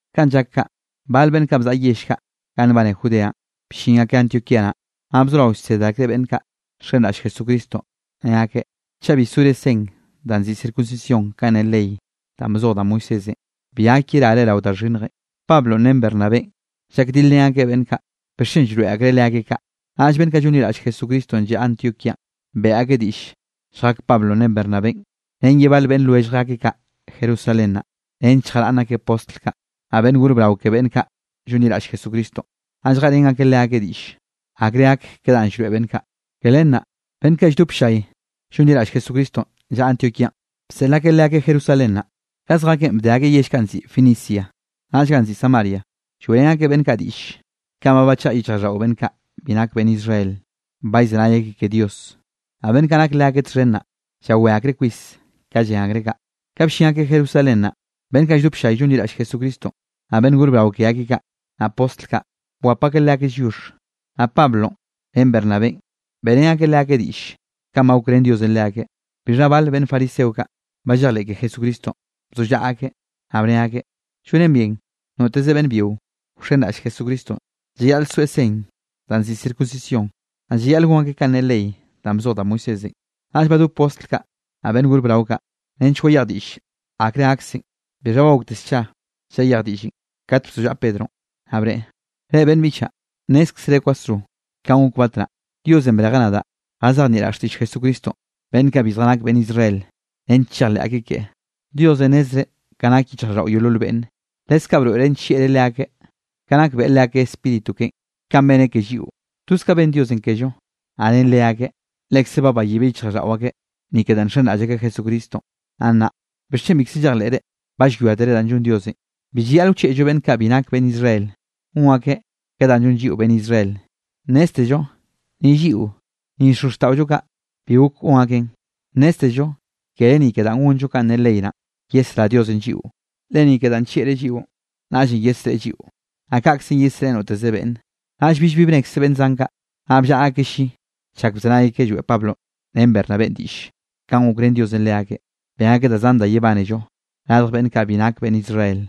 Kanꞌ llak kaꞌ, bal beꞌnn bzaꞌa yell kaꞌ ganꞌ nbane Judeanꞌ, bllin akeꞌ Antioquía naꞌ, naꞌ bzorao llsed akreꞌ beꞌnn kaꞌ nxenraꞌll Jesucristonꞌ, ne akeꞌ: —Chaꞌ bi sore sen danꞌ nziꞌi circuncisión kanꞌ ne ley danꞌ bzoj da Moisésenꞌ, bi gak yerare rao da xhinnjenꞌ. Pablonꞌ ren Bernabénꞌ llakdilrén akeꞌ beꞌnn kaꞌ, bixchen llroeꞌ akreꞌ leakeꞌ kaꞌ. Naꞌll beꞌnn kaꞌ llonliraꞌll Jesucristonꞌ llaꞌa Antioquíanꞌ, beꞌe akeꞌ diꞌll lljak Pablonꞌ ren Bernabénꞌ ren ye bal beꞌnn lwellj akeꞌ kaꞌ Jerusalén naꞌ, nench lljaraꞌnn akeꞌ postl kaꞌ, naꞌ beꞌnn gor brao ke beꞌnn kaꞌ llonliraꞌll Jesucristonꞌ, naꞌ lljeꞌrén akeꞌ leakeꞌ diꞌlle, akre gak ke danꞌ llroeꞌ beꞌnn kaꞌ. Ke len naꞌ, beꞌnn kaꞌ lldop ll-llay llonliraꞌll Jesucristonꞌ llaꞌa Antioquíanꞌ, bseꞌl akeꞌ leakeꞌ Jerusalén naꞌ. Ka zjakeꞌn bde akeꞌ yell kaꞌ ganꞌ nziꞌi Fenicia, naꞌll ganꞌ nziꞌi Samaria. Lloeꞌrén akeꞌ beꞌnn kaꞌ diꞌll kanꞌ ba bachaꞌa yichjraꞌlldaꞌo beꞌnn kaꞌ bi nak beꞌnn Israel, ba llzenay akeꞌ ke Dios. Naꞌ beꞌnn kaꞌ nak leakeꞌ txhen naꞌ, llawé akreꞌ kwis ka llen akreꞌ kaꞌ. Ka bllin akeꞌ Jerusalén naꞌ, beꞌnn kaꞌ lldop ll-llay llonliraꞌll Jesucristonꞌ, naꞌ beꞌnn gor brao ke akeꞌ kaꞌ, naꞌ postl kaꞌ, bwap akeꞌ leakeꞌ lliox. Naꞌ Pablonꞌ ren Bernabénꞌ beꞌrén akeꞌ leakeꞌ diꞌll kanꞌ ba gokrén Diosenꞌ leakeꞌ. Bixha bal beꞌnn fariseo kaꞌ ba llejleꞌ ke Jesucristonꞌ, bzollaꞌa akeꞌ, naꞌ bne akeꞌ: —Llonen bien noteze beꞌnn byio wxenraꞌll Jesucristonꞌ, llayaꞌl soeꞌ sen danꞌ nziꞌi circuncisión, naꞌ llayaꞌl gon akeꞌ kanꞌ ne ley danꞌ bzoj da Moisésenꞌ. Naꞌll badop postl kaꞌ, naꞌ beꞌnn gor brao kaꞌ, nench wayej diꞌll akre gaksen. Bixha ba gokte scha llayej diꞌllenꞌ, kat bzollaꞌa Pedronꞌ, naꞌ bneꞌe: —Reꞌ, beꞌnn biꞌchaꞌ, nnézkzere kwasro kanꞌ gok batnaꞌ, Diosenꞌ brejeꞌ nadaꞌ jazejnieꞌraꞌ xtiꞌll Jesucristonꞌ beꞌnn kaꞌ bi zjanak beꞌnn Israel, nench chejleꞌ akeꞌ keꞌe. Diosenꞌ nnezreꞌ ka nak yichjraꞌlldaꞌo yeolol beꞌnne, leskaꞌ broeꞌreꞌ nllieꞌreꞌ leakeꞌ, ka nak beꞌe leakeꞌ Spíritu keꞌen kanꞌ beneꞌ ke lliꞌo. Toz ka ben Diosenꞌ kello, naꞌ ren leakeꞌ, lekze ba bayibeꞌ yichjraꞌlldaꞌo akeꞌ, ni ke danꞌ nxenraꞌll akeꞌ Jesucristonꞌ. Naꞌ nnaꞌ, ¿bixchen bikze llejleꞌre, ba llwiátere danꞌ llon Diosenꞌ? Bi llayaꞌl wchieꞌllo beꞌnn kaꞌ bi nak beꞌnn Israel, gon akeꞌ ke danꞌ llon lliꞌo beꞌnn Israel, nnéztello ni lliꞌo, ni xozxtaꞌollo kaꞌ, bi gok gon akeꞌn. Nnéztello kere ni ke danꞌ gonllo kanꞌ ne ley naꞌn, yesrá Diosenꞌ lliꞌo, le ni ke danꞌ nllieꞌreꞌ lliꞌon, naꞌllenꞌ yesreꞌe lliꞌo, naꞌ kaꞌkze yesreꞌe noteze beꞌnne. Naꞌll billbi bnekze beꞌnn zan kaꞌ, naꞌll bllaꞌa akeꞌ lli chak bzenay akeꞌ lloeꞌ Pablonꞌ ren Bernabénꞌ diꞌll kanꞌ gokrén Diosenꞌ leakeꞌ, ben akeꞌ da zan da yebánello radj beꞌnn kaꞌ bi nak beꞌnn Israel.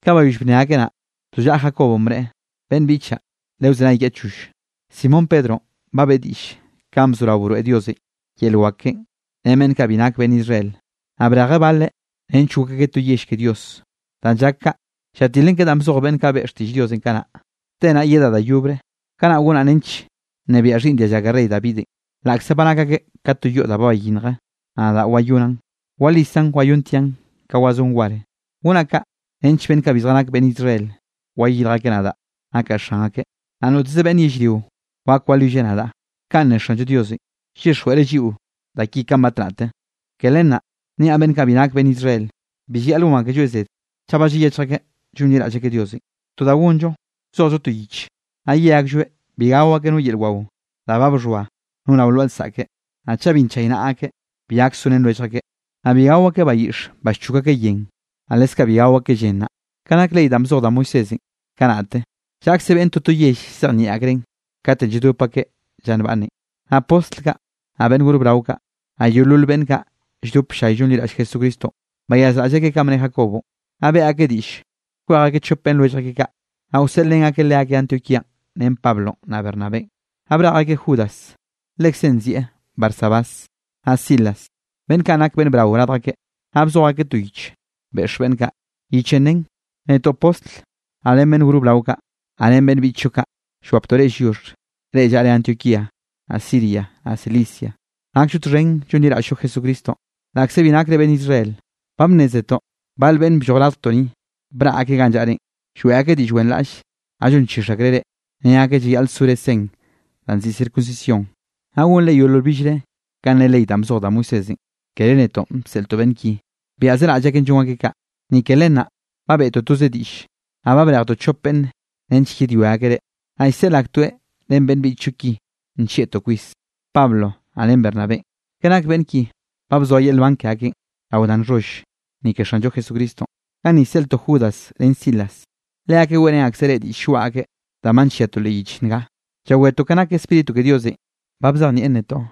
Ka bayoll bnne akeꞌ naꞌ, bzollaꞌa Jacobonꞌ bneꞌe: —Beꞌnn biꞌchaꞌ, lewzenay kiaꞌ choll. Simón Pedronꞌ ba beꞌe diꞌll kanꞌ bzorao broeꞌ Diosenꞌ yel wak keꞌen ren beꞌnn kaꞌ bi nak beꞌnn Israel, naꞌ brejeꞌ baleꞌ nench gok akeꞌ to yell ke Dios. Danꞌ llak kaꞌ, llatilen ke danꞌ bzoj beꞌnn kaꞌ beꞌe xtiꞌll Diosenꞌ kanaꞌ: Te naꞌ yedaꞌ da yobre, kanaꞌ gonaꞌ nench nnebiaꞌ xhiꞌnn dialla ke rey Davidenꞌ, laꞌkze ba nak akeꞌ ka to yoꞌ da ba bayinnje, naꞌ nadaꞌ wayonaꞌn, walisaꞌn wayontiaꞌn ka wazón war, gonaꞌ kaꞌ nench beꞌnn kaꞌ bi zjanak beꞌnn Israel, wayirj akeꞌ nadaꞌ nakaꞌ Xan akeꞌ, naꞌ noteze beꞌnn yellrio wak walwilleꞌ nadaꞌ. Kanꞌ ne Xanllo Diosenꞌ llyixjweꞌreꞌ lliꞌo da ki kanꞌ batnaꞌte. ’Ke len naꞌ, niaꞌ beꞌnn kaꞌ bi nak beꞌnn Israel, bi llayaꞌl gon akelloeꞌ zed, chaꞌ ba llayechj akeꞌ llonliraꞌll akeꞌ Diosenꞌ. To da gonllo, wzojllo to yich, naꞌ ye aklloeꞌ bi gao akeꞌ no yel wao da ba bxhoa no rao lwaꞌa lsaꞌke, naꞌ chaꞌ bi nchaynaꞌa akeꞌ, bi gak sorén lwellj akeꞌ, naꞌ bi gao akeꞌ bayiꞌx ba llchok akeꞌ yen, naꞌ leskaꞌ bi gao akeꞌ llen naꞌ. Ka nak ley danꞌ bzoj da Moisésenꞌ kanaꞌte, llaꞌkze beꞌnn toto yell llzejnieꞌ akreꞌn, katenꞌ lladop akeꞌ lla nbaꞌnne. Naꞌ postl kaꞌ, naꞌ beꞌnn gor brao kaꞌ, naꞌ yeolol beꞌnn kaꞌ lldop ll-llay llonliraꞌll Jesucristonꞌ, bayazraꞌll akeꞌ kanꞌ bne Jacobonꞌ. Naꞌ beꞌe akeꞌ diꞌll kwej akeꞌ chop beꞌnn lwellj akeꞌ kaꞌ, naꞌ wseꞌlrén akeꞌ leakeꞌ Antioquíanꞌ ren Pablonꞌ naꞌ Bernabénꞌ. Naꞌ brej akeꞌ Judas lekze nzieꞌ Barsabás, naꞌ Silas, beꞌnn kaꞌn nak beꞌnn brao radj akeꞌ. Naꞌ bzoj akeꞌ to yich beꞌx beꞌnn kaꞌ, yichenꞌ nen: “Netoꞌ postl, naꞌ ren beꞌnn gor brao kaꞌ, naꞌ ren beꞌnn biꞌchllo kaꞌ, llwaptoꞌ reꞌ lliox, reꞌ llaꞌre Antioquía, naꞌ Siria, naꞌ Cilicia. Nakllo txhen llonliraꞌll-llo Jesucristonꞌ, laꞌkze bi nakre beꞌnn Israel. Ba bnnézetoꞌ bal beꞌnn blloj radjtoꞌ ni, braꞌ akeꞌ ganꞌ llaꞌrenꞌ lloeꞌ akeꞌ diꞌll wenraꞌll, naꞌ llonchix akreꞌ reꞌ, ne akeꞌ llayaꞌl sore sen danꞌ nziꞌi circuncisión, naꞌ gonre yeolol billre kanꞌ ne ley danꞌ bzoj da Moisésenꞌ. Kere netoꞌ bseꞌltoꞌ beꞌnn ki, byaꞌzeraꞌll akeꞌn llon akeꞌ kaꞌ. Ni ke len naꞌ, ba beꞌtoꞌ toze diꞌlle, naꞌ ba brejtoꞌ chop beꞌnn nench yedwia akeꞌ reꞌ, naꞌ llseꞌl aktoeꞌ ren beꞌnn biꞌchllo ki nllieꞌtoꞌ kwis, Pablo naꞌ ren Bernabénꞌ. Ke nak beꞌnn ki ba bzoa yel nban ke akeꞌn rao da nxholl, ni ke Xanllo Jesucristonꞌ. Ganni llseꞌltoꞌ Judas ren Silas, leakeꞌ weꞌrén akseꞌ reꞌ diꞌll lloaꞌ akeꞌ, danꞌ ba nlliatoꞌ leꞌ yich nga. Llawetoꞌ ka nak Spíritu ke Diosenꞌ ba bzejnieꞌn netoꞌ,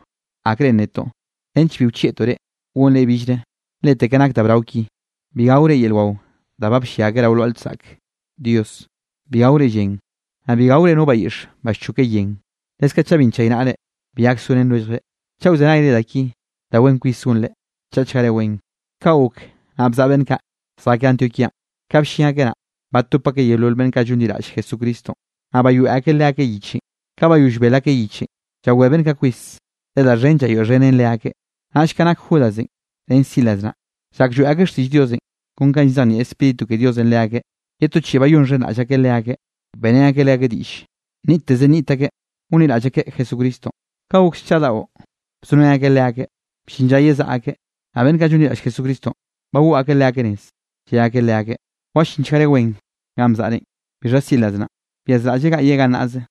akre nnetoꞌ nench bi wchieꞌtoꞌ reꞌ gonre billre, lete ka nak da brao ki: Bi gaore yel wao da ba bllia akeꞌ rao lwaꞌa lsaꞌk Dios, bi gaore llen, naꞌ bi gaore no bayiꞌx ba llchoke yen, leskaꞌ chaꞌ bi nchaynaꞌre, bi gak sorén lwelljre. Chaꞌ wzenayre da ki, da wen kwis gonre. Chaꞌchgare wen.” Kaꞌ gok, naꞌ bzaꞌa beꞌnn kaꞌ, zjakeꞌ Antioquíanꞌ, ka bllin akeꞌ naꞌ, batop akeꞌ yeolol beꞌnn kaꞌ llonliraꞌll Jesucristonꞌ, naꞌ bayoeꞌ akeꞌ leakeꞌ yichenꞌ. Ka bayoll bel akeꞌ yichenꞌ, llawé beꞌnn kaꞌ kwis, le da xhen llayoeꞌxhenen leakeꞌ. Naꞌll ka nak Judasenꞌ ren Silas naꞌ, llak lloeꞌ akeꞌ xtiꞌll Diosenꞌ kon ka llzejnieꞌ Spíritu ke Diosenꞌ leakeꞌ, ye to chiꞌi bayonxhenraꞌll akeꞌ leakeꞌ, beꞌrén akeꞌ leakeꞌ diꞌll nniꞌtteze nniꞌt akeꞌ gonliraꞌll akeꞌ Jesucristonꞌ. Ka gok scha daꞌo bzorén akeꞌ leakeꞌ, bllin lla yezaꞌa akeꞌ, naꞌ beꞌnn kaꞌ llonliraꞌll Jesucristonꞌ, bagoꞌ akeꞌ leakeꞌ nez, lle akeꞌ leakeꞌ: —Wallinchgare wen ganꞌ bzaꞌrenꞌ. Bixha Silas naꞌ, byazraꞌlleꞌ gaꞌyeꞌ gannaꞌze.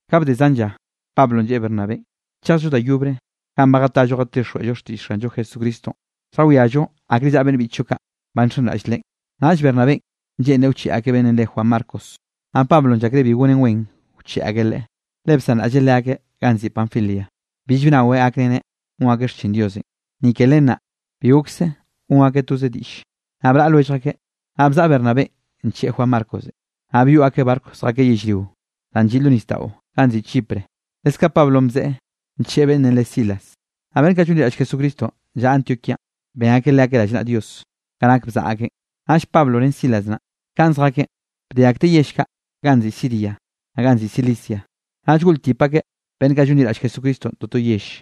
Ka bde zan lla, Pablonꞌ lleꞌe Bernabénꞌ: —Chejllo da yobre ganꞌ ba jatallo jatixjweꞌllo xtiꞌll Xanllo Jesucristonꞌ, lljawiallo akre llaꞌa beꞌnn biꞌchllo kaꞌ ba nxenraꞌll Leꞌen. Naꞌll Bernabénꞌ lleꞌnreꞌ wcheꞌe akeꞌ beꞌnnenꞌ re Juan Marcos. Naꞌ Pablonꞌ llakreꞌ bi gonen wen wcheꞌe akeꞌ leꞌe, le bsanraꞌlleꞌ leakeꞌ ganꞌ nziꞌi Panfilia, bill bnaweꞌ gakreneꞌ gon akeꞌ xchin Diosenꞌ. Ni ke len naꞌ, bi gokse gon akeꞌ toze diꞌlle, naꞌ braꞌa lwellj akeꞌ. Naꞌ bzaꞌa Bernabénꞌ ncheꞌe Juan Marcos, naꞌ byoꞌ akeꞌ barco zjakeꞌ yellrio danꞌ lliꞌ lo nisdaꞌo ganꞌ nziꞌi Chipre. Leskaꞌ Pablonꞌ bzeꞌe ncheꞌe beꞌnnenꞌ re Silas, naꞌ beꞌnn kaꞌ llonliraꞌll Jesucristonꞌ llaꞌa Antioquíanꞌ, ben akeꞌ leakeꞌ rallnaꞌa Dios, ka nak bzaꞌa akeꞌn. Naꞌll Pablonꞌ ren Silas naꞌ, ka zjakeꞌn, bde akteꞌ yell kaꞌ ganꞌ nziꞌi Siria, naꞌ ganꞌ nziꞌi Cilicia, naꞌ llgoꞌltip akeꞌ beꞌnn kaꞌ llonliraꞌll Jesucristonꞌ toto yell.